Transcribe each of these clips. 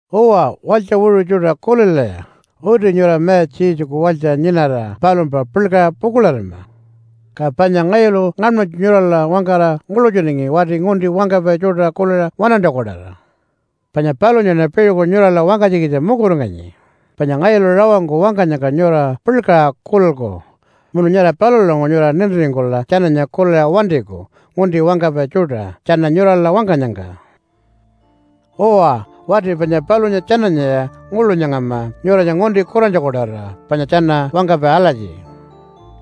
Uwa, walytja wiṟu tjuṯa, kulilaya! Uti nyura Mayatja Jesuku walytja nyinara palumpa puḻkaṟa pukuḻarima. Ka panya ngayulu ngaṉmanytju nyurala wangkara nguḻutjunangi wati ngunti wangkapai tjuṯa kuliṟa waṉantjaku-tawara. Panya palunyaṉa piṟuku nyurala wangkanytjikitja mukuringanyi, panya ngayulu rawangku wangkanyangka nyura puḻkaṟa kulilku munu nyara palulanguṟu nyura nintiringkula tjananya kuliṟa wantiku ngunti wangkapai tjuṯa tjana nyurala wangkanyangka. Uwa, wati panya palunya tjananyaya nguḻu nyangama nyuranya ngunti kurantjaku-tawara panya tjana wangkapai alatji,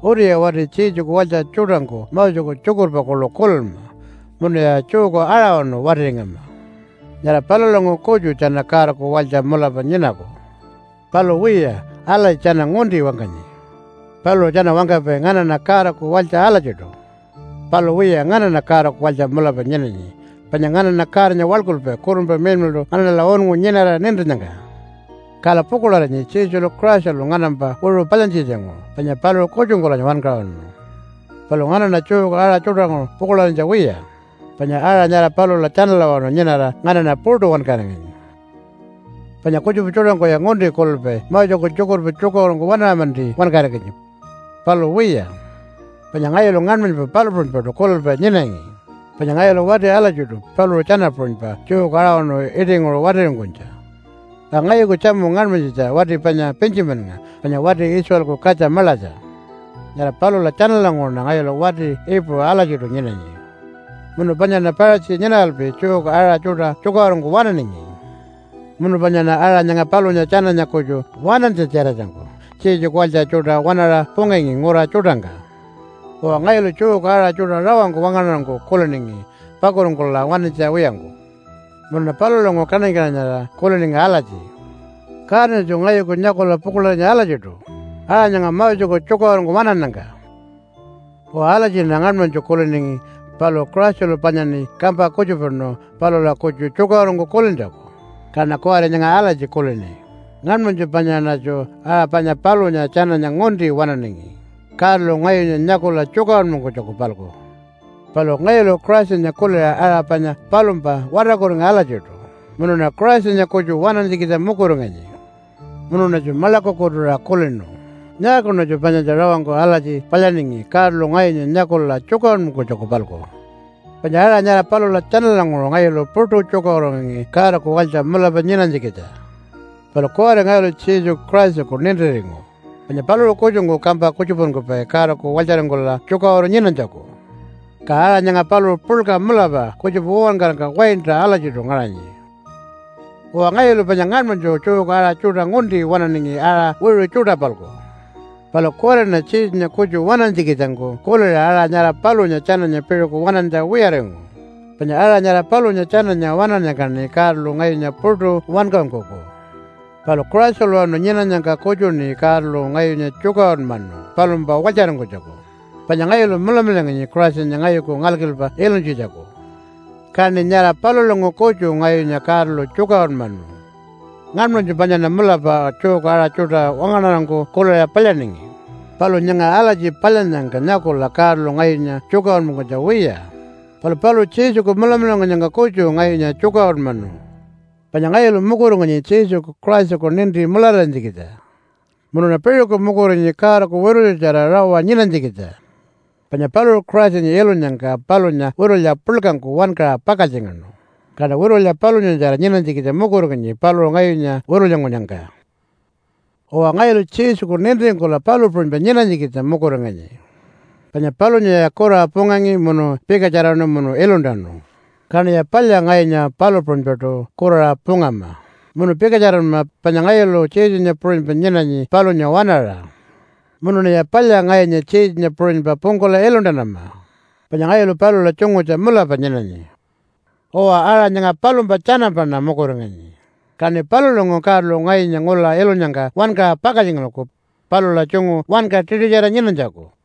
“Utiya wati Jesuku walytja tjuṯangku Moseku tjukurpa kuḻu kulinma munuya Jewku aṟawanu watiringama. Nyara palulanguṟu kutju tjana Godaku walytja mulapa nyinaku.” Palu wiya, alatji tjana ngunti wangkanyi. Paluṟu tjana wangkapai, “Nganaṉa Godaku walytja alatjiṯu.” Palu wiya, nganaṉa Godaku walytja mulapa nyinanyi, panya nganaṉa Godanya waḻkulpai Kurunpa Miḻmiḻṯu nganaṉala unngu nyinara nintinnyangka. Kala pukuḻarinyi Jesulu Christalu nganampa wiṟu palyantjitjanguṟu, panya paluṟu kutjungkulanya wankaṟunu. Palu nganaṉa Jewku aṟa tjuṯanguṟu pukuḻarinytja wiya, panya aṟa nyara palula tjanalawanu nyinara nganaṉa puṯu wankaringanyi. Panya kutjupa tjuṯangkuya ngunti kulilpai Moseku tjukurpa tjukaṟurungku waṉaṟa-manti wankaringanyi. Palu wiya. Panya ngayulu ngaṉmanypa palu puṟunypaṯu kulilpai nyinangi, panya ngayulu wati alatjiṯu paluṟu tjana puṟunypa Jewku aṟawanu iṯinguṟu watiringkunytja. Ka ngayuku tjamu ngaṉmanyitja wati panya Pintjimannga panya wati Israelku katja maḻatja. Nyara palula tjanalanguṟuṉa ngayulu wati Iipuṟu alatjiṯu nyinanyi. Munu panyaṉa Paṟatji nyinaralpi Jewku aṟa tjuṯa tjukaṟurungku waṉaningi. Munu panyaṉa aṟa nyanga palunya tjananya kutju waṉantja-tjiratjangku Jesuku walytja tjuṯa waṉaṟa pungangi ngura tjuṯangka. Uwa, ngayulu Jewku aṟa tjuṯa rawangku wangaṉarangku kuliningi pakuringkula wantinytja wiyangku. Munuṉa palulanguṟu kaṉany-kaṉanyarira kuliningi alatji, “Godanyatju ngayuku nyakula pukuḻarinyi alatjiṯu aṟa nyanga Moseku tjukaṟurungku waṉannyangka.” Uwa, alatjiṉa ngaṉmanytju kuliningi, palu Christalu panyaṉi kampa kutjupanu palula kutju tjukaṟurungku kulintjaku, kaṉa kuwari nyanga alatji kulini, “Ngaṉmanytju panyaṉatju aṟa panya palunya tjananya ngunti waṉaningi Godalu ngayunya nyakula tjukaṟurunmankunytjaku-palku.” Palu ngayulu Christanya kuliṟa aṟa panya palumpa watarkuringu alatjiṯu munuṉa Christanya kutju waṉantjikitja mukuringanyi. Munuṉatju maḻakukutuṟa kulinu, “Nyaakuṉatju panyatja rawangku alatji palyaningi Godalu ngayunya nyakula tjukaṟurunmankunytjaku-palku?” Panya aṟa nyara palula tjanalanguṟu ngayulu puṯu tjukaṟururingangi Godaku walytja mulapa nyinanytjikitja. Palu kuwari ngayulu Jesuku Christaku nintiringu, panya paluṟu kutjungku kampa kutjupankupai Godaku walytjaringkula tjukaṟuru nyinanytjaku. Ka aṟa nyanga paluṟu puḻka mulapa kutjupa uwankarangka waintaṟa alatjiṯu ngaṟanyi. Uwa, ngayulu panya ngaṉmanytju Jewku aṟa tjuṯa ngunti waṉaningi aṟa wiṟu tjuṯa-palku. Palu kuwariṉa Jesunya kutju waṉantjikitjangku kuliṟa aṟa nyara palunya tjananya piṟuku waṉantja wiyaringu, panya aṟa nyara palunya tjananya waṉannyangkaṉi Godalu ngayunya puṯu wankaṟunkuku. Palu Christalawanu nyinanyangka kutjuṉi Godalu ngayunya tjukaṟurunmanu palumpa walytjaringkunytjaku, panya ngayulu mulamularinganyi Christanya ngayuku ngalkilpa ilunytjitjaku. Kaṉi nyara palulanguṟu kutju ngayunya Godalu tjukaṟurunmanu. Ngaṉmanytju panyaṉa mulapa Jewku aṟa tjuṯa wangaṉarangku kuliṟa palyaningi, palu nyanga alatji palyannyangka nyakula Godalu ngayunya tjukaṟurunmankunytja wiya, palu paluṟu Jesuku mulamularingkunyangka kutju ngayunya tjukaṟurunmanu. Panya ngayulu mukuringanyi Jesuku Christaku ninti mulararinytjikitja. Munuṉa piṟuku mukuringanyi Godaku witulyatjara rawa nyinanytjikitja. Panya paluṟu Christanya ilunyangka palunya witulya puḻkangku wankaṟa pakaltjingaṉu, kaṉa witulya palunyatjara nyinanytjikitja mukuringanyi paluṟu ngayunya witulyankunyangka. Uwa, ngayulu Jesuku nintiringkula palu puṟunypa nyinanytjikitja mukuringanyi. Panya palunyaya kuraṟa pungangi munu pikatjaraṉu munu iluntanu, kaṉiya palya ngayunya palu puṟunypaṯu kuraṟa pungama munu pikatjaranma panya ngayulu Jesunya puṟunypa nyinanyi palunya waṉaṟa. Munuṉiya palya ngayunya Jesunya puṟunypa pungkula iluntanama, panya ngayulu palula tjungutja mulapa nyinanyi. Uwa, aṟa nyanga palumpa tjanampaṉa mukuringanyi, kaṉi palulanguṟu Godalu ngayunya ngula ilunyangka wankaṟa pakaltjingalku palula tjungu wanka tiṯutjara nyinanytjaku.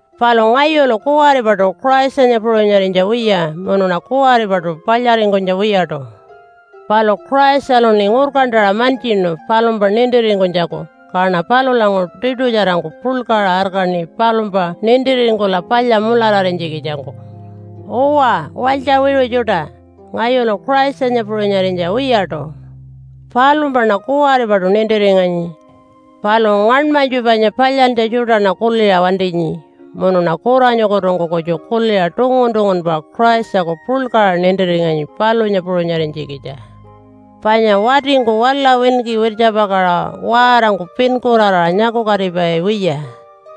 Palu ngayulu kuwaripaṯu Christanya puṟunyarinytja wiya munuṉa kuwaripaṯu palyaringkunytja wiyaṯu. Palu Christaluṉi ngurkantaṟa mantjinu palumpa nintiringkunytjaku, kaṉa palulanguṟu tiṯutjarangku puḻkaṟa arkaṉi palumpa nintiringkula palya mulararinytjikitjangku. Uwa, walytja wiṟu tjuṯa. Ngayulu Christanya puṟunyarinytja wiyaṯu. Palumpaṉa kuwaripaṯu nintiringanyi. Palu ngaṉmanytju panya palyantja tjuṯaṉa kuliṟa wantinyi munuṉa kuranyukutungku kutju kuliṟa tungun-tungunpa Christaku puḻkaṟa nintiringanyi palunya puṟunyarinytjikitja. Panya watingku wala winki wirtjapakaṟa waarangku pinkuraraṟa nyakukatipai wiya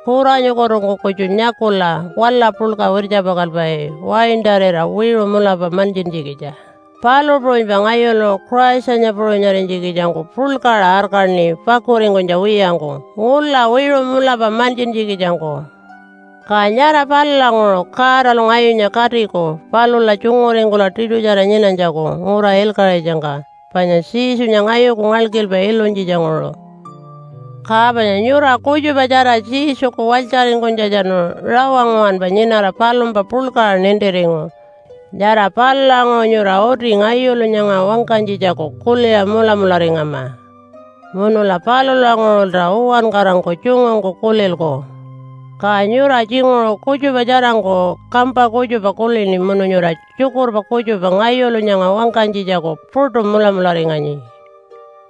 kuranyukutungku kutju nyakula wala puḻka wirtjapakalpai waintarira wiṟu mulapa mantjintjikitja, palu puṟunypa ngayulu Christanya puṟunyarinytjikitjangku puḻkaṟa arkaṉi pakuringkunytja wiyangku ngula wiṟu mulapa mantjintjikitjangku. Ka nyara palulanguṟu Godalu ngayunya katiku palula tjunguringkula tiṯutjara nyinanytjaku ngura ilkaṟitjangka, panya Jesunya ngayuku ngalkilpa ilunytjitjanguṟu. Ka panya nyura kutjupatjara Jesuku walytjaringkunytjatjanu rawa nguwanpa nyinara palumpa puḻkaṟa nintiringu. Nyara palulanguṟu nyura uti ngayulu nyanga wangkanytjitjaku kuliṟa mulamularingama. Munula palulanguṟulta uwankarangku tjungungku kulilku. Ka nyura tjinguṟu kutjupa tjarangku kampa kutjupa kulini munu nyura tjukurpa kutjupa ngayulu nyanga wangkanytjitjaku puṯu mulamularinganyi.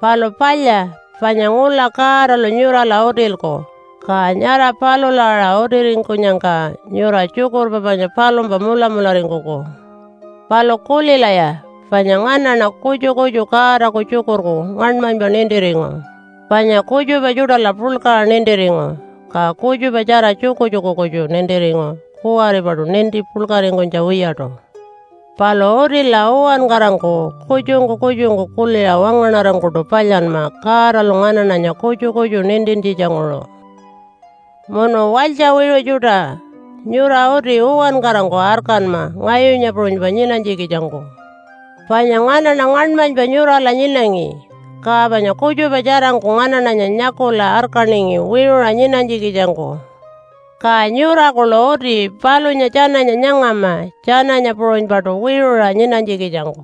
Palu palya, panya ngula Godalu nyurala utilku, ka nyara palula aṟa utiringkunyangka nyura tjukurpa panya palumpa mulamularingkuku. Palu kulilaya, panya nganaṉa kutju kutju Godaku tjukurku ngaṉmanypa nintiringu, panya kutjupa tjuṯala puḻkaṟa nintiringu, ka kutjupatjara tjukutjuku kutju nintiringu kuwaripaṯu ninti puḻkaringkunytja wiyaṯu. Palu utila uwankarangku kutjungku kutjungku kuliṟa wangaṉarangkuṯu palyanma Godalu nganaṉanya kutju kutju nintintjitjanguṟu. Munu walytja wiṟu tjuṯa, nyura uti uwankarangku arkanma ngayunya puṟunypa nyinanytjikitjangku. Panya nganaṉa ngaṉmanypa nyurala nyinangi, ka panya kutjupa tjarangku nganaṉanya nyakula arkaningi wiṟuṟa nyinanytjikitjangku. Ka nyura kuḻu uti palunya tjananya nyangama tjananya puṟunypaṯu wiṟuṟa nyinanytjikitjangku.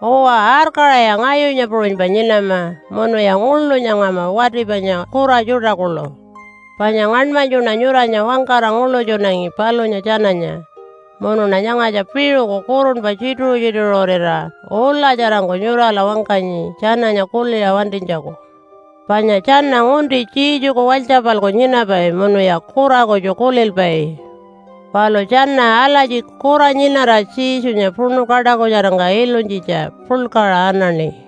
Uwa, arkaṟaya ngayunya puṟunypa nyinama, munuya nguḻu nyangama wati panya kura tjuṯa kuḻu, panya ngaṉmanytjuṉa nyuranya wangkara nguḻutjunangi palunya tjananya, munuṉa nyangatja piṟuku kurunpa tjituṟu-tjituṟurira ulatjarangku nyurala wangkanyi tjananya kuliṟa wantinytjaku. Panya tjana ngunti Jesuku walytja-palku nyinapai munuya kura kutju kulilpai. Palu tjana alatji kura nyinara Jesunya puṉu kaṯakutjarangka ilunytjitja puḻkaṟa anaṉi.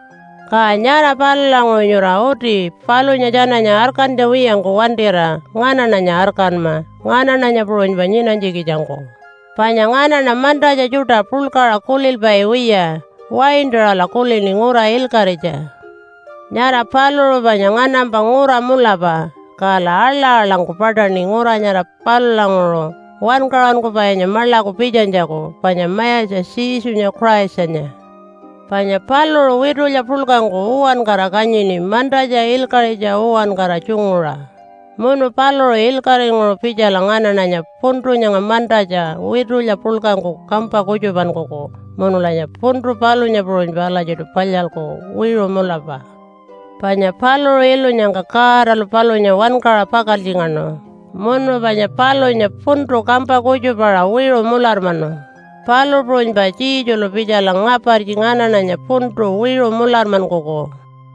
Ka nyara palulanguṟu nyura uti palunya tjananya arkantja wiyangku wantira nganaṉanya arkanma nganaṉanya puṟunypa nyinanytjikitjangku, panya nganaṉa mantatja tjuṯa puḻkaṟa kulilpai wiya, waintaṟala kulini ngura ilkaṟitja. Nyara paluṟu panya nganampa ngura mulapa. Kala aḻa-aḻangku paṯaṉi ngura nyara palulanguṟu Wankaṟunkupainya maḻaku pitjanytjaku panya Mayatja Jesunya Christanya. Panya paluṟu witulya puḻkangku uwankara kanyini mantatja, ilkaṟitja uwankara tjunguṟa, munu paluṟu ilkaṟinguṟu pitjala nganaṉanya puntu nyanga mantatja witulya puḻkangku kampa kutjupankuku munulanya puntu palunya puṟunypa alatjiṯu palyalku wiṟu mulapa. Panya paluṟu ilunyangka Godalu palunya wankaṟa pakaltjingaṉu munu panya palunya puntu kampa kutjupaṟa wiṟu mularmanu, palu puṟunypa Jesulu pitjala ngapartji nganaṉanya puntu wiṟu mularmankuku.